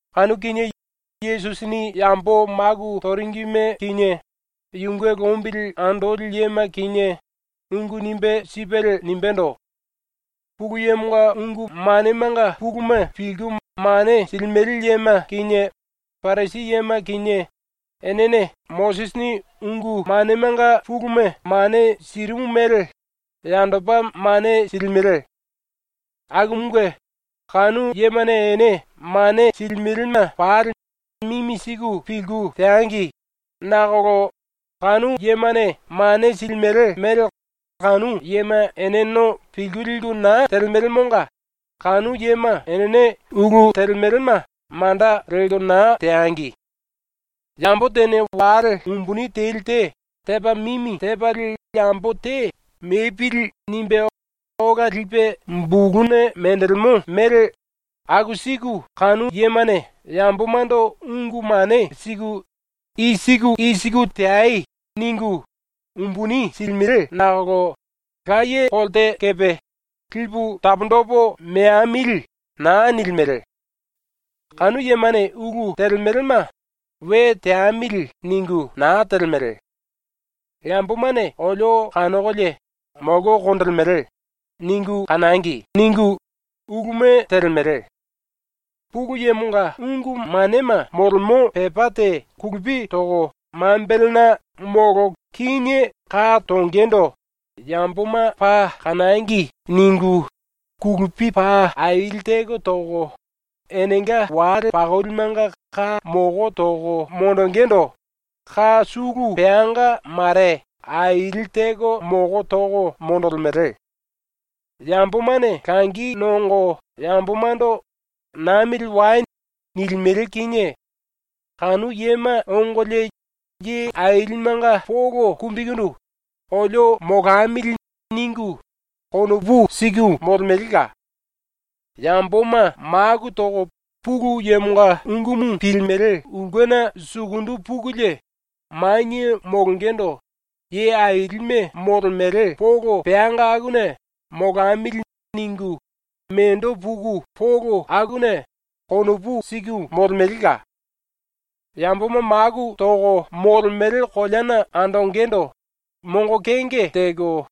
Kanu kinie Yesusini yambo maku toringime kinie, yunge lombili andoli yema kinie, ungu nimbe sipelie nimbendo: “Pulu Yemonga ungu manemanga puluma pilku mane silimele yema kinie Parisi yema kinie enene Mosisini ungu manemanga puluma mane sirimu mele yandopa mane silimele. Akumunge kanu yemane ene mane silimelema pali mimi siku pilku teangi, nakolo kanu yemane mane silimele mele kanu yema eneno pilku liku na telemelemonga kanu yema enene ulu telemelema manda lelko na teangi. Yambo tene wale umbuni teli te tepa mimi tepalie yambo te ‘mepili.’ nimbe ola lipe buluna menjilimo mele ⸤aku siku kanu yemane yambomando ungu mane siku “I siku i siku teai.” ningu⸥ umbuni silimele nakolo laye kolte kepe ‘Lipu taponjipu meamili.’ na nilimele. “Kanu yemane ulu telemelema ‘we teamili.’ ningu na telemele. ‘Yambomane olio kanokolie ‘molko konjilimele.’ ningu kanangi.’ ningu uluma telemele. Pulu Yemonga ungu manema molemo pepá te kulupi toko mambelena molo kíne ka tongendo ‘Yamboma paa kanangi.’ ningu kulupi paa aili teko toko, enenga wale pakolimenga ka moko toko monjingindu ka sulu peanga mare aili teko moko toko monjilimele. Yambomane langi nongo yambomando “Namili wai.” nilimele kinie kanu yema ongolie ye ailimenga polo kumbikundu ‘olio molamili.’ ningu konopu siku molemelela. Yamboma maku toko Pulu Yemonga ungumu pilimele ulkena sukundu pukulie manie molongendo ye ailime molemele polo peanga akuna ‘molamili.’ ningu mendo puku polo akuna konopu siku molemelela. Yamboma maku toko molemele koleana andongendo mongo kenge teko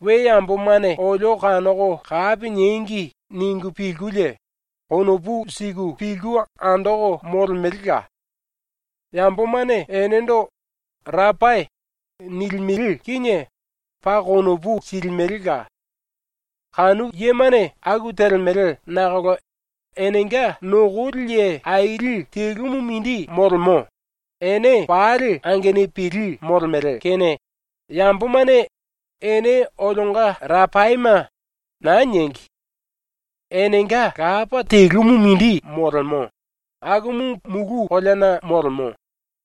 ‘We yambomane olio kanoko kapi niengi.’ ningu pilkulie konopu siku pilku andoko molemelela. Yambomane enendo ‘Rapai’ nilimele kinie paa konopu silimelela. “⸤Kanu yemane aku telemele⸥ nakolo enenga nokoli ye aili telumu mindi molemo, ene pali angenupili molemele kene yambomane “ene olionga Rapaime.” na niengi. Enenga Lapa telumu mindi molemo, akumu mulu koleana molemo,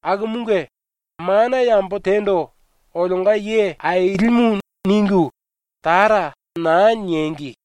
akumunge mana yambo tendo ⸤‘olionga ye ailimu’ ningu⸥ “Tara” na niengi.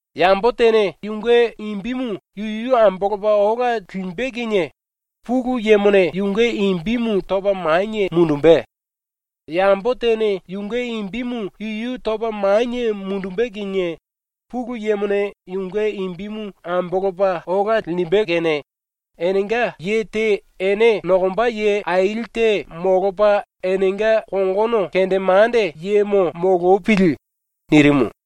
Yambo tene yunge imbimu yuyu ambolopa ola limbe kinie ⸤Pulu Yemone⸥ yunge imbimu topa manie mundumbe; yambo tene yunge imbimu yuyu topa manie mundumbe kinie ⸤Pulu Yemone⸥ yunge imbimu ambolopa ola linjimbe kene enenga ye te ene nokomba ye aili te molopa enenga kongono kendemande yemo molopili.” ⸤nirimu.⸥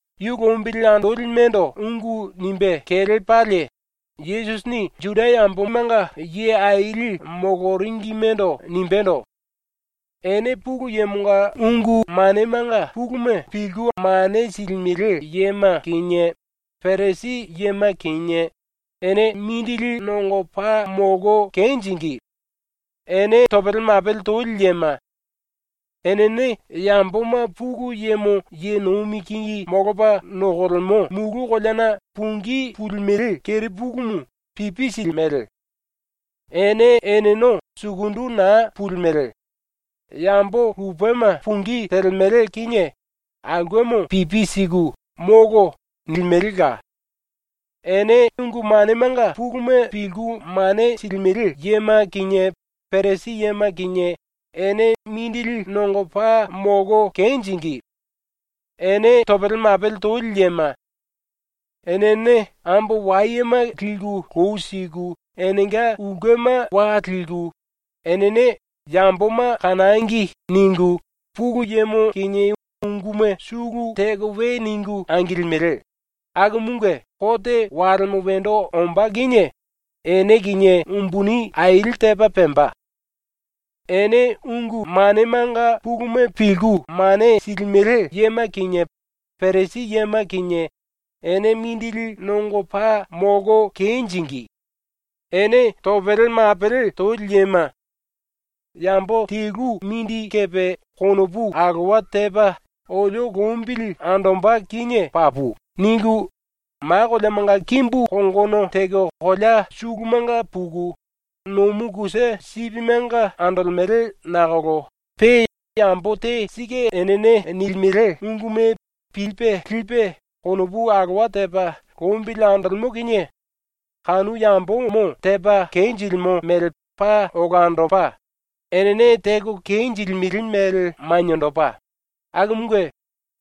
⸤Yu lombili andolimendo ungu nimbe kelepalie Yesusini Juda yambomanga ye aili moloringimendo nimbendo⸥: “Ene Pulu Yemonga ungu manemanga puluma pilku mane silimele yema kinie, Parisi yema kinie, ene mindili nongo paa molko kenjingí! Ene topele mapele toli yema! Enene yamboma Pulu Yemo ye nomi kingi molopa nokolemo mulu koleana pungí pulimele kerepulumu pipi silimele. Ene eneno sukundu na pulimele; yambo lupema pungí telemele kinie aulkemo pipi siku “Molo.” nilimelela. “(Ene ungu manemanga puluma pilku mane silimele yema kinie Parisi yema kinie ene mindili nongo paa molko kenjingí! Ene topele mapele toli yema! Enene ambo wayema liku lou siku enenga ulkema wa liku, enene ‘Yamboma kanangi.’ ningu Pulu Yemo kinie unguma sulu teko we ningu angilimele, akumunge kote walemo wendo ombá kinie ene kinie umbuni aili tepa pemba.) “Ene ungu manemanga puluma pilku mane silimele yema kinie Parisi yema kinie ene mindili nongo paa molko kenjingí! Ene topele mapele toli yema! ‘Yambo telu mindi kepe konopu alowa tepa olio lombili andomba kinie papu.’ ningu ma koleamanga kimbu kongono teko kolea sulumanga puku, nomu kusa sipimenga andolemele nakolo pe yambo te sike enene nilimele unguma pilipe lipe konopu alowa tepa lombili andolemo kinie kanu yambomo tepa kenjilimo mele paa olandopa, enene teko kenjilimele mele maniendopa, akumunge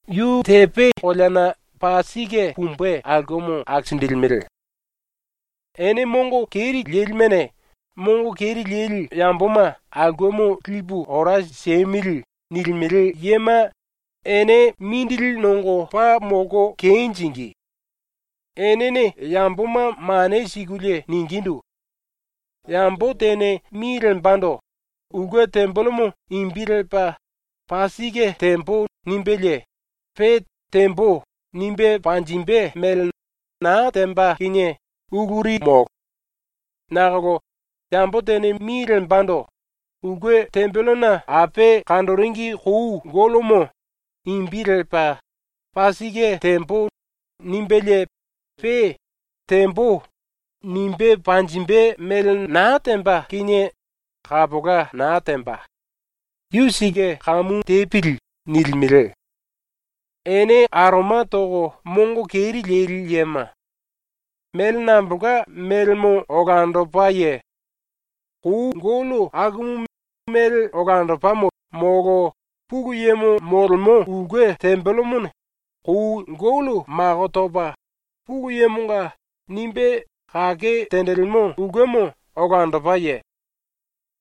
yu tepe koleana paa sike pumbe aulkemo akisinjilimele. “Ene mongo keri lelimene “⸤Mongo keri leli⸥ yamboma aulkemo lipu ora siemili.” nilimele yema ene mindili nongo paa molko kenjingí! Enene yamboma mane sikulie ningindu: “Yambo tene mi lembando ‘ulke tembelemo’ imbi lepa “Paa sike tembo.” nimbelie pe “Tembo.” nimbe panjimbe mele na temba kinie uluri molo. Nakolo yambo tene mi lembando “ulke tembelena ape kanjiringi kou gollomo” imbi lepa “Paa sike tembo.” nimbelie pe “Tembo.” nimbe panjimbe mele na temba kinie kapola na temba. Yu sike kamu tepili.” nilimele. Ene aroma toko mongo keri leli yema! Mele nambolka melemo olandopaye? Kou gollo akumu mele olandopamo molo Pulu Yemo molemo ulke tembelemone kou gollo mako topa ‘Pulu Yemonga’ nimbe kake tenjilimo ulkemo olandopaye?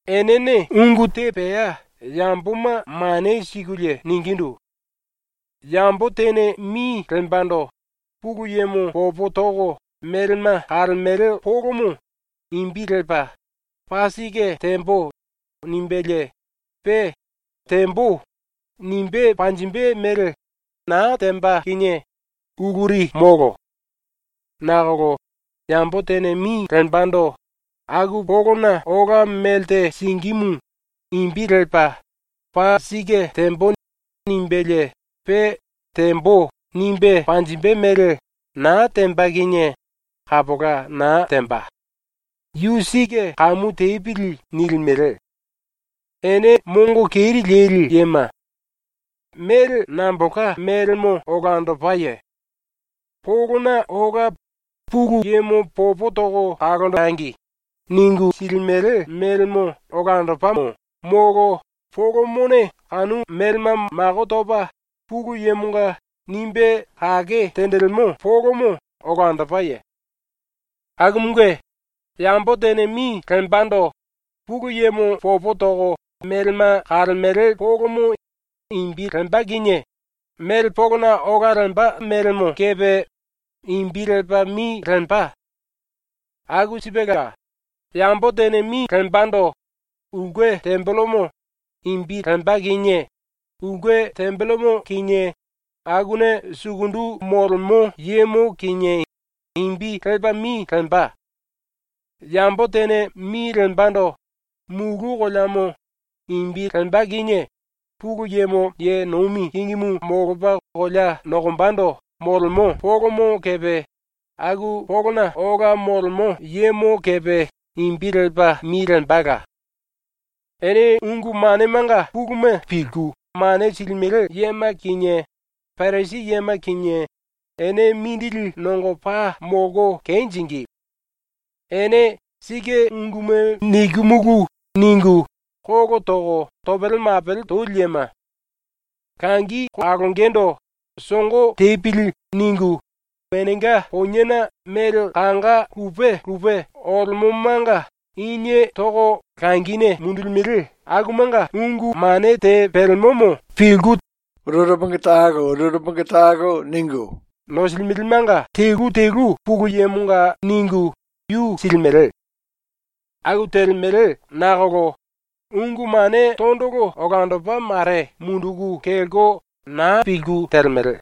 “Enene ungu te pea yamboma mane sikulie ningindu: “Yambo tene mi lembando ‘Pulu Yemo popo toko melema kalemele polomo’ imbi lepa “Paa sike tembo.” nimbelie pe “Tembo.” nimbe panjimbe mele na temba kinie uluri molo. Nakolo yambo tene mi lembando “aku polona ola melte singímu” imbi lepa “Paa sike tembo.” nimbelie pe “Tembo.” nimbe panjimbe mele na temba kinie kapola na temba. Yu sike kamu tepili.” nilimele. Ene mongo keri leli yema! Mele nambolka melemo olandopaye? Polona ola ‘Pulu Yemo popo toko kalonjengi.’ ningu silimele melemo olandopamo molo polomone kanu melema mako topa ‘Pulu Yemonga’ nimbe kake tenjilimo polomo olandopaye? “Akumunge, yambo tene mi lembando ‘Pulu Yemo popo toko melema kalemele polomo’ imbi lemba kinie mele polona ola lemba melemo kepe imbi lepa mi lemba. Aku sipela yambo tene mi lembando ‘ulke tembelemo’ imbi lemba kinie ulke tembelemo kinie akuna sukundu molemo yemo kinie imbi lepa mi lemba. Yambo tene mi lembando ‘mulu koleamo’ imbi lemba kinie Pulu Yemo ye nomi kingimu molopa kolea nokombando molemo polomo kepe aku polona ola molemo yemo kepe imbi lepa mi lembala. “Ene ungu manemanga puluma pilku mane silimele yema kinie, Parisi yema kinie, ene mindili nongo paa molko kenjingí! Ene ‘sike unguma nikimulu.’ ningu kolo toko topele mapele toli yema! Langi kalongendo ‘songo tepili.’ ningu enenga poniena mele kanga lupe lupe olemomanga inie toko langine mundulimele akumanga ungu mane te pelemomo pilku tene tene ningu nosilimelemanga telu telu Pulu Yemonga ningu yu silimele. Aku telemele nakolo ungu mane tondolo olandopa mare munduku kelko na pilku telemele.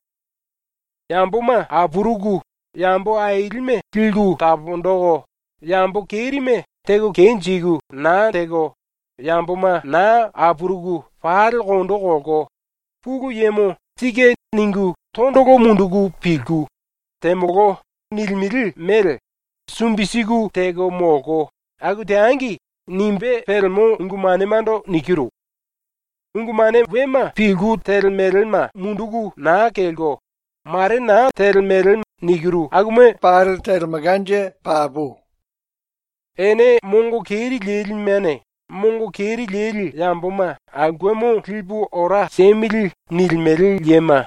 ‘Yamboma apuruku yambo ailime liku taponjiku yambo kerime teko kenjiku na teko, yamboma na apuruku pali kondo kolko, Pulu Yemo ‘Sike.’ ningu tondolo munduku pilku “Temolo.” nilimele mele sumbi siku teko molko, aku teangi.’ nimbe pelemo ungu manemando nikiru. Ungu mane wema pilku telemelema munduku na kelko ‘mare na telemele’ nikiru akuma pali telemelkanje papu. Ene mongo keri lelimene “⸤Mongo keri leli⸥ yamboma aulkemo lipu ora siemili.” nilimele yema,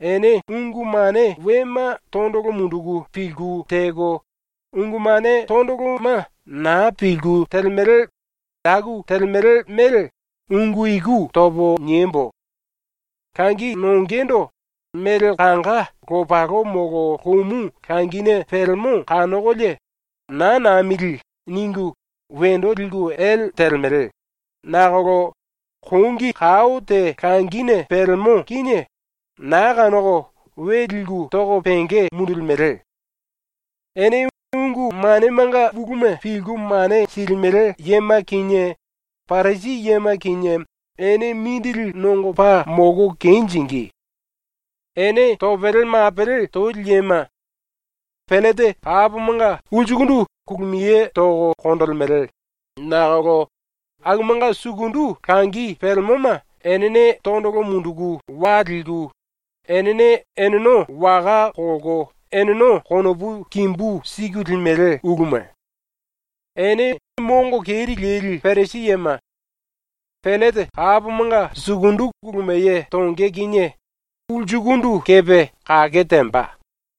ene ⸤ungu mane wema tondolo munduku pilku teko, ungu mane tondoloma na pilku telemele aku telemele mele ungu iku topo niembo:⸥ Langi nongendo mele kanga lopalo molo lomou langine pelemo kanokolie ‘Naa namili.’ ningu wendo liku ele telemele, nakolo kongi kao te langine pelemo kinie na kanoko we liku toko penge mundulimele. “Ene ungu manemanga puluma pilku mane silimele yema kinie Parisi yema kinie, ene mindili nongo paa molko kenjingí! Ene topele mapele toli yema! Pellete kapomanga ulsukundu kulumiye toko konjilimele nakolo akumanga sukundu langi pelemoma enene tondolo munduku wa liku, enene eneno waka kolko eneno konopu kimbu siku limele uluma. Ene mongo keri leli Parisi yema! Pellete kapomanga sukundu kulumiye tonge kinie ulsukundu kepe kake temba.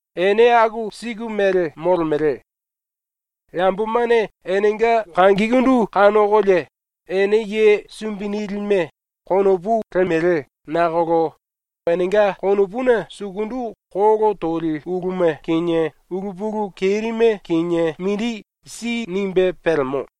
Ene aku siku mele molemele. Yambomane enenga kangikundu kanokolie ‘Ene ye sumbi nilime’ konopu lemele nakolo enenga konopuna sukundu kolo toli uluma kinie ulu pulu kerime kinie mindi si nimbe pelemo.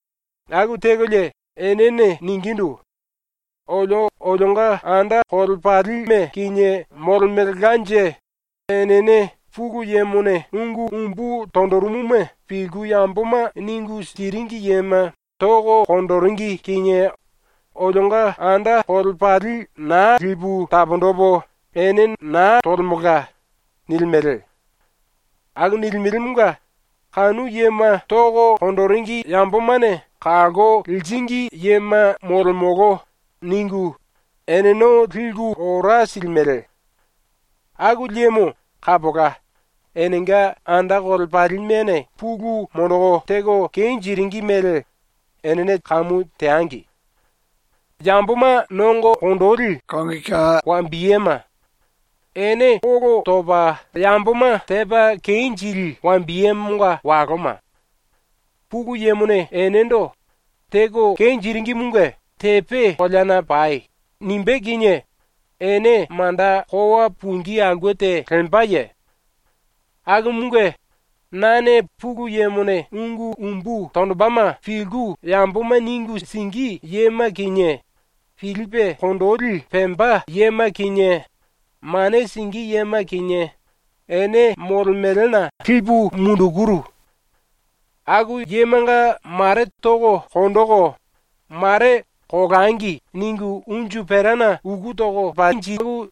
Aku tekolie enene ningindu: “Olio olionga anda kolepalime kinie molemelkanje enene Pulu Yemone ungu umbu tonjirimuma pilku yamboma ningu siringi yema toko konjiringi kinie olionga anda kolepali na lipu taponjipu ene na tolemelka.” nilimele. Aku nilimelemonga ‘Kanu yema toko konjiringi yambomane kalko liringi yema molemolo.’ ningu eneno liku ora silimele. Aku liemo kapola enenga anda kolepalimene pulu monjiku teko kenjiringi mele enene kamu teangi. “⸤Yamboma nongo konjili⸥ wambiyema! Ene kolo topa yamboma tepa kenjili wambiyemonga waloma! Pulu Yemone enendo “Teko kenjiringimunge tepe koleana pai.” nimbé kinie ene manda kowa pungí aulke te lembaye? Akumunge nane Pulu Yemone ungu umbu tonjimbema pilku yamboma ningu singí yema kinie, pilipe konginjili pemba yema kinie, mane singí yema kinie, ene molemelena lipu mundukuru. Aku yemanga mare toko konjiku, mare ‘Kolangi.’ ningu unju perana uku toko monjiku,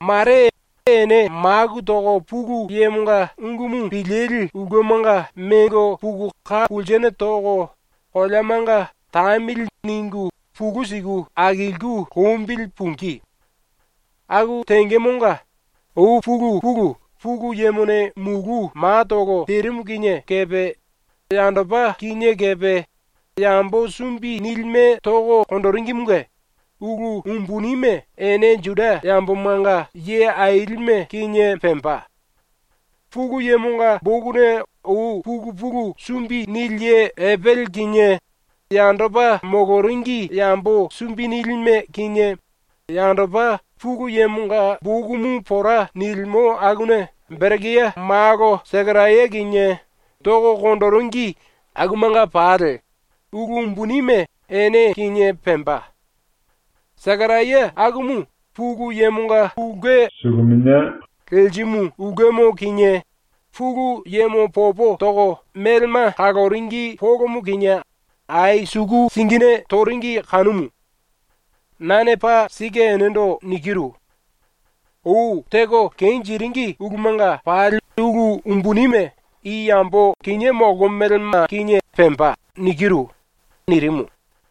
mare ene maku toko Pulu Yemonga ungumu pilili ulkemanga mengo puku ka pulsene toko, koleamanga ‘tamili.’ ningu pulú siku akilku lombili pungí. Aku tengemonga ou pulu pulu ⸤Pulu Yemone mulu matolo terimu kinie⸥ kepe yandopa kinié kepe yambo sumbi nilime toko konjiringimunge ulu umbunime ene ⸤Juda yambomanga ye ailime⸥ kinie pemba. ⸤Pulu Yemonga bokuna⸥ ou pulu pulu sumbi nili ye Epele kinie, yandopa moloringi yambo sumbi nilime kinie, yandopa ⸤Pulu Yemonga bokumu pora nilimo akuna⸥ Berekia malo Sekaraya kinie toko konjiringi akumanga pali ulu umbunime ene kinie pemba. Sekaraya akumu Pulu Yemonga ulke suluminia lerimu ulkemo kinie Pulu Yemo popo toko melema kaloringi polomo kinie ai suku singine toringi kanumu. Nane paa sike enendo nikiru: Ou teko kenjiringi ulumanga pali ulu umbunime i yambo kinié molkomelema kinie pemba.” ⸤nirimu.⸥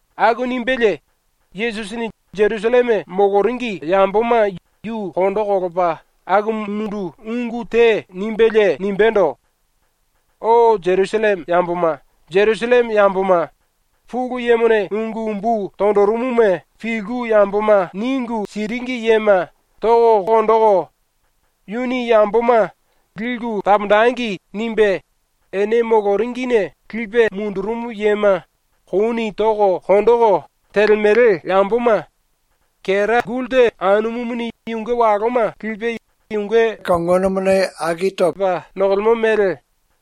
⸤Aku nimbelie Yesusini Jerusalleme moloringi yamboma yu kondo kolopa akumundu ungu te nimbelie nimbendo:⸥ “O Jerusalleme ⸤yamboma⸥, Jerusalleme ⸤yamboma⸥, Pulu Yemone ungu umbu tonjirimuma pilku yamboma ningu siringi yema toko konjiku, yuni yamboma ‘liku taponjengi.’ nimbe ene moloringine lipe mundurumu yema kouni toko konjiku telemele yamboma, kera gulta anumumuni yunge waloma lipe yunge kongona lopi tepa nokolemo mele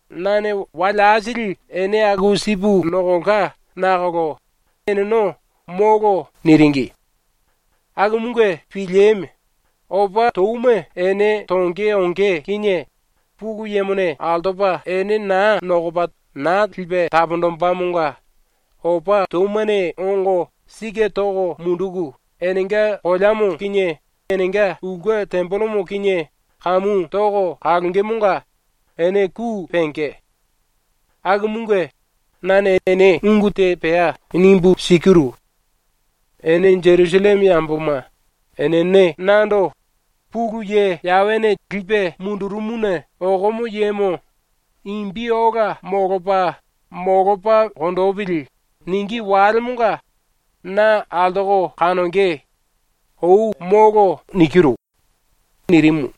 nane wale aisili ene aku sipu nokolka nakolo eneno “Molo!” niringi. Akumunge pilieme! ⸤Opa touma ene tonge onge kinie Pulu Yemone altopa ene na nokopa na lipe taponjimbemonga⸥ opa toumane ongo sike toko munduku enenga koleamo kinie enenga ulke tembelemo kinie kamu toko kalongemonga ene ku penge. Akumunge ⸤nane ene ungu te pea nimbu sikiru:⸥ Ene Jerusalleme yamboma, enene nando “Pulu Ye Yawene lipe mundurumuna okomo yemo imbi ola molopa, molopa konjipili.” ningí walemonga na altoko kanonge. Ou molo.” nirimu.